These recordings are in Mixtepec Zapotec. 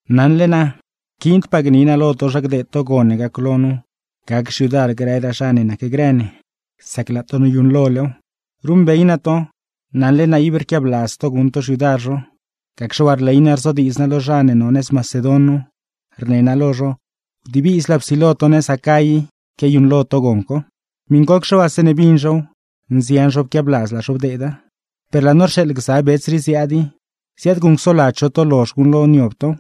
Naṉle naa, rquiindpaa gni naa lo to zha gdeed to gon ne gaclo nu gac xyudar grëraa zha ne nacgrë ne, sac laa to noyuṉlolew. Ruṉbey naa to, naṉle naa ible rquiabladz to guṉ to xyudar zho, gacxe waa rley naa rzodiidz naa lo zha ne no nëz Macedon nu, rne naa lo zho: wdibizlaa psilo to nëz Acay i quiayuṉlo to gon co. Miṉcocxe waa, zeeṉe bin zhow, nzian zho pquiabladz laa zho bdeeda. Per laa no rxeeḻ gza bets rii ziaad i, ziaadguṉcsoladz zho to lozh guṉlo niob tow;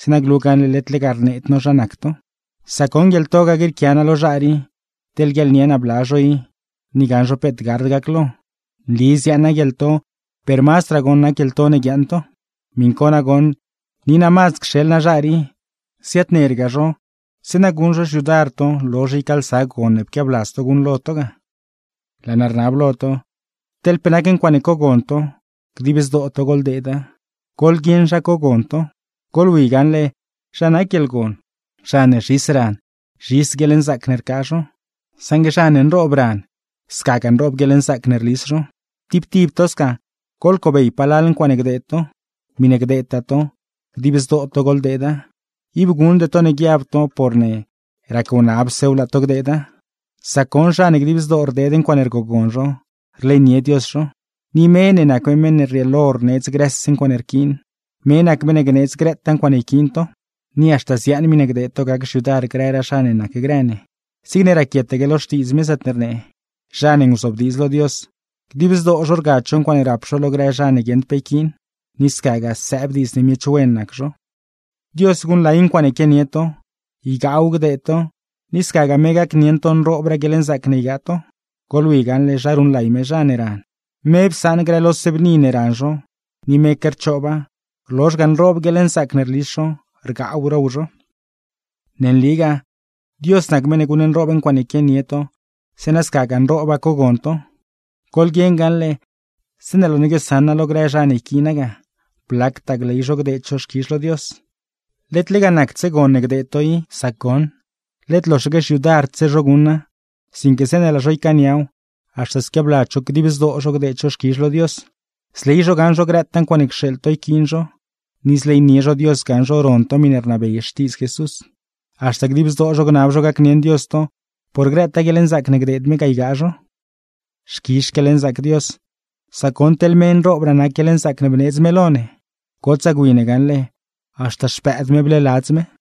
zeeṉa glu gaṉle led lega rneed no zha nac to. Sac goṉ guieḻto ga grieequia naa lo zha rii, teḻ guiaḻnie naa bla zho i, ni gaṉ zho peet gard gaclo. Nli ziaaṉ naa guieḻto, per mazdraa goṉ nac guieḻto ne guiaaṉ to. Miṉ co nagoṉ, ni naa mazd cxeḻ naa zha rii, ziaadnerga zho zeeṉa guṉ zho xyudar to lozh ycaalsa gon ne pquiabladz to guṉlo to ga. Laa naa rnab lo to, teḻ pe nac ncuaaṉe cogon to, dib zdoo to goḻdeeda. Goḻguieṉ zha cogon to. Goḻwi gaṉle zha nac guieḻgon: Zha ne zhis ran, zhis guieḻnzaac ne rcaa zho; saṉgue zha ne nroob ran, scagaa nroob guieḻnzaac ne rlis zho. Tib tib to sca, goḻcobey palal ncuaaṉe gdeed to. Miṉe gdeedtaa to, dib zdoo to goḻdeeda; ib guṉde to ne guiab to por rac-wnabsew laa to gdeeda. Sac goṉ, zha ne dib zdoo rdeed ncuaaṉe rgogon zho, rleynie Dios zho. Ni me ne nac me meṉ ne rrieelo rneedz grëse ncuaaṉe rquiin, me nac meṉ ne gneedz grëtaa ncuaaṉe yquiin to; ni haxta ziaaṉ miṉe gdeed to gac xyudar grëraa zha ne nacgrë ne. Zigne raquietaque lo Xtiidz me, zaatne rnee: Zha ne nguzobdiidz lo Dios, dib zdoo zho rgad zho ncuaaṉe rap zho lo grë zha ne guieṉd pe yquiin; ni scagaa sëëb diidz ne miech wen nac zho. Dios guṉlay ncuaaṉe quianie to, ygaaw gdeed to, ni scagaa me gacnieṉ to nroobraa guieḻnzaac ne ygaa to. Goḻwi gaṉle, zha ruṉlay me zha ne ran: Me psaṉ grëse lo bni ne ran zho, ni meque rchooba; rlozh ga, nroob guieḻnzaac ne rlis zho, rgaaw row zho. Ne nligaa, Dios nac meṉ ne guṉnroob ncuaaṉe quianie to, zeeṉa scagaa nrooba cogon to. Goḻguieṉ gaṉle, zeeṉe laa no guiosaṉa lo grë zha ne yquiina ga, blactaa gley zho gdeed zho xquizh lo Dios. Led lega nacdse gon ne gdeed to i. Sac goṉ, led loxaque xyudardse zho guṉa, sinque zeeṉe laa zho ycaaniaw, haxta squiabladz zho dib zdoo zho gdeed zho xquizh lo Dios. Zley zho gaṉ zho grëtaa ncuaaṉe cxeeḻ to yquiin zho; ni zleynie zho Dios gaṉ zho ron to miṉe rnabey Xtiidz Jesús. Haxta dib zdoo zho gnab zho gacnieṉ Dios to, por grëtaa guieḻnzaac ne gdeed me ga ygaa zho. ¡Xquizh xquieḻnzaac Dios, sac goṉ teḻ me nroobraa nac guieḻnzaac ne bneedz me lo ne! ¡Gotsaa gwi ne gaṉle, haxta Xpëëd me bleeladz me!